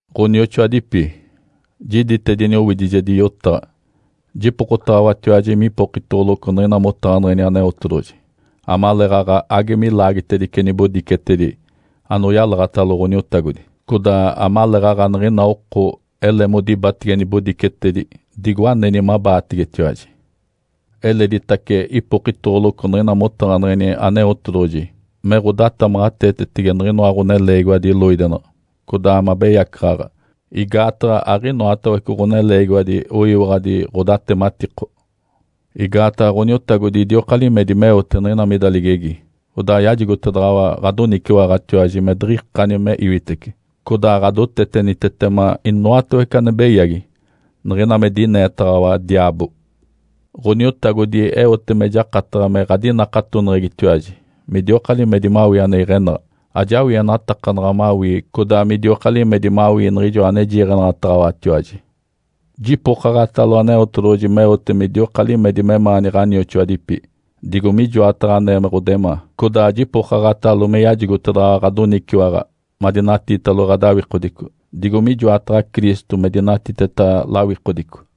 Ǥonioxoadipi, jiditedini owidijedi yotaɡ̶a. Jipokotaɡ̶awatiwaji mipokitoɡ̶oloco niɡ̶ina motaɡ̶aneɡ̶eni Aneotedoɡ̶oji amaleeɡ̶aɡ̶a age milaagitedice nibodicetedi anoyalaɡ̶atalo Ǥoniotagodi, codaa amaleeɡ̶aɡ̶a niɡ̶ina oko ele modibatege nibodicetedi, digo aneni mabaategetiwaji. Eleditace ipokitoɡ̶oloco niɡ̶ina motaɡ̶aneɡ̶eni Aneotedoɡ̶oji me ɡ̶odatamaɡ̶ateetetege niɡ̶inoa ɡ̶oneleegiwadi loidenaɡ̶a, codaa mabeyacaɡ̶aɡ̶a, igaataɡ̶a aɡ̶inoatawece ɡ̶oneleegiwadi oyiwaɡ̶adi ɡ̶odatematiko. Igaataɡ̶a Ǥoniotagodi idioka limedi meote niɡ̶ina mida ligegi. Odaa yajigotedaɡ̶awa ɡ̶adoniciwaɡ̶atiwaji me diɡ̶ikani me iwitece, codaa ɡ̶adotetenitetema inoatawece ane beyagi niɡ̶ina me dineetaɡ̶awa diaabo. Ǥoniotagodi eote me jakataɡ̶a me ɡ̶adinakatoneɡ̶egitiwaji midioka limedi mawii ane iɡ̶enaɡ̶a. Ajawienatakanaɡ̶a mawii codaa midioka limedi mawii niɡ̶ijo ane jiiɡ̶enaɡ̶ataɡ̶awatiwaji. Jipokaɡ̶atalo Aneotedoɡ̶oji meote midioka limedi memaani ɡ̶anioxoadipi digo mijoataɡ̶a anee me ɡ̶odemaa, codaa jipokaɡ̶atalo me yajigotedaɡ̶awa ɡ̶adoniciwaɡ̶a madinatiitalo ɡ̶adawikodico digo mijoataɡ̶a Cristo me dinatiteta lawikodico.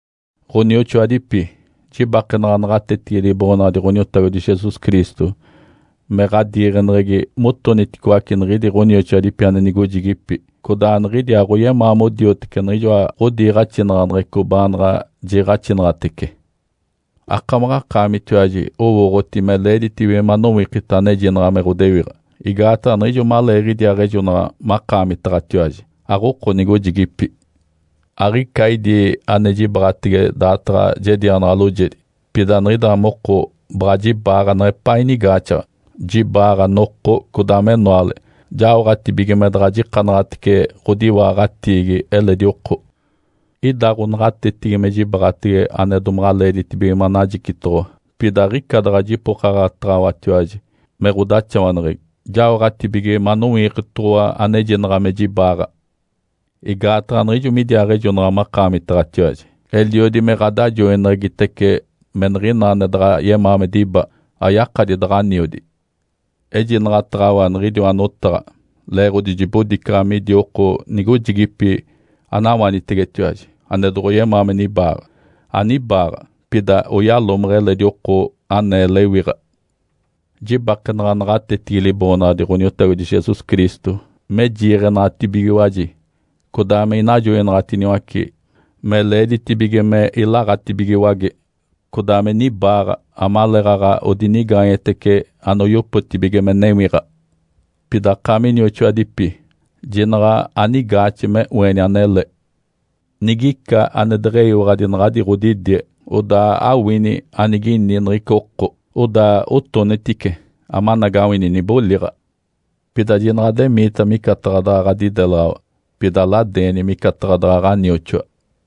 Ǥonioxoadipi, jibakenaɡ̶a naɡ̶atetigi Liboonaɡ̶adi Ǥoniotagodi Jesus Cristo me ɡ̶adiiɡ̶eneɡ̶egi motoniticoace niɡ̶idi ɡ̶onioxoadipi ane nigojigipi, codaa niɡ̶idi aɡ̶oyemaa modioteci niɡ̶ijoa ɡ̶odiiɡ̶axinaɡ̶aneɡ̶eco baanaɡ̶a jiiɡ̶axinaɡ̶atece. Akamaɡ̶akaamitiwaji owooɡ̶oti me leeditibige manowikita anejinaɡ̶a me ɡ̶odewiɡ̶a. Igaataɡ̶a niɡ̶ijo maleeɡ̶idiaaɡ̶ejonaɡ̶a makaamitaɡ̶atiwaji, aɡ̶oko nigojigipi. Aɡ̶ica idi ane jibaɡ̶atege daataɡ̶a jedianaɡ̶a loojedi. Pida niɡ̶ida moko baɡ̶a jibaaɡ̶a neɡ̶epaa inigaaxaɡ̶a. Jibaaɡ̶a noko, codaa menoale, jaoɡ̶atibige me daɡ̶a jikanaɡ̶atece ɡ̶odiwaaɡ̶atiigi eledi oko. Ida ɡ̶onaɡ̶atetigi me jibaɡ̶atege ane domaɡ̶a leeditibige manajicitoɡ̶owa, pida aɡ̶ica daɡ̶a jipokaɡ̶ataɡ̶awatiwaji me ɡ̶odaxawaneɡ̶egi, jaoɡ̶atibige manowikitoɡ̶owa anejinaɡ̶a me jibaaɡ̶a. Igaataɡ̶a niɡ̶ijo midiaaɡ̶ejonaɡ̶a makaamitaɡ̶atiwaji, eliodi me ɡ̶adajoineɡ̶egitece me niɡ̶ina ane daɡ̶a yemaa me diba, ayakadi daɡ̶aniodi. Ejinaɡ̶ataɡ̶awa niɡ̶idiwa notaɡ̶a leeɡ̶odi jibodicaɡ̶a midi oko nigojigipi anawanitegetiwaji ane doɡ̶oyemaa me nibaaɡ̶a. Anibaaɡ̶a, pida oyalomeɡ̶e eledi oko anee lewiɡ̶a. Jibakenaɡ̶a naɡ̶atetigi Liboonaɡ̶adi Ǥoniotagodi Jesus Cristo me jiiɡ̶enaɡ̶atibigiwaji codaa me inajoinaɡ̶atiniwace me leeditibige me ilaɡ̶atibigiwage, codaa me nibaaɡ̶a amaleeɡ̶aɡ̶a odinigaanyetece anoyopotibige me newiɡ̶a. Pida akaami inioxoadipi, jinaɡ̶a anigaaxe me oeni anele. Nigica ane deɡ̶eyiwaɡ̶adi naɡ̶adi ɡ̶odidie, odaa awini anigini niɡ̶ica oko, odaa otonitice, amanagawini niboliɡ̶a. Pida jinaɡ̶a ademiita micataɡ̶a daɡ̶a ɡ̶adidelaɡ̶awa, baɡ̶a aladeeni micataɡ̶a ɡ̶anioxoa.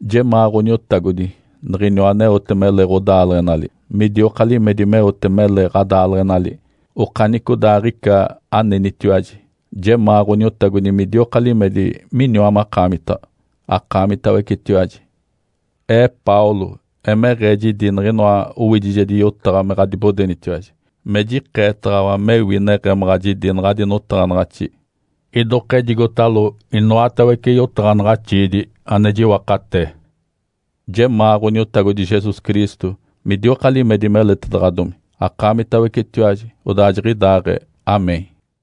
Jemaa Ǥoniotagodi, niɡ̶iniwa aneote mele ɡ̶odaaleɡ̶enali, midioka limedi meote mele ɡ̶adaaleɡ̶enali okanicodaaɡ̶ica anenitiwaji, Jemaa Ǥoniotagodi midioka limedi miniwa makaamitaɡ̶a, akaamitawecetiwaji. Ee Paulo, emeɡ̶ee jidi niɡ̶inoa owidijedi yotaɡ̶a, me ɡ̶adibodenitiwaji me jikeetaɡ̶awa mewi neɡ̶emaɡ̶a jidi naɡ̶adi notaɡ̶anaɡ̶axi. Idokejigotalo inoatawece yotaɡ̶anaɡ̶axiidi ane jiwakatee. Jemaa Ǥoniotagodi Jesus Cristo midioka limedi meletedaɡ̶adomi, akaamitawecetiwaji. Odaa jiɡ̶idaaɡ̶ee (Amém).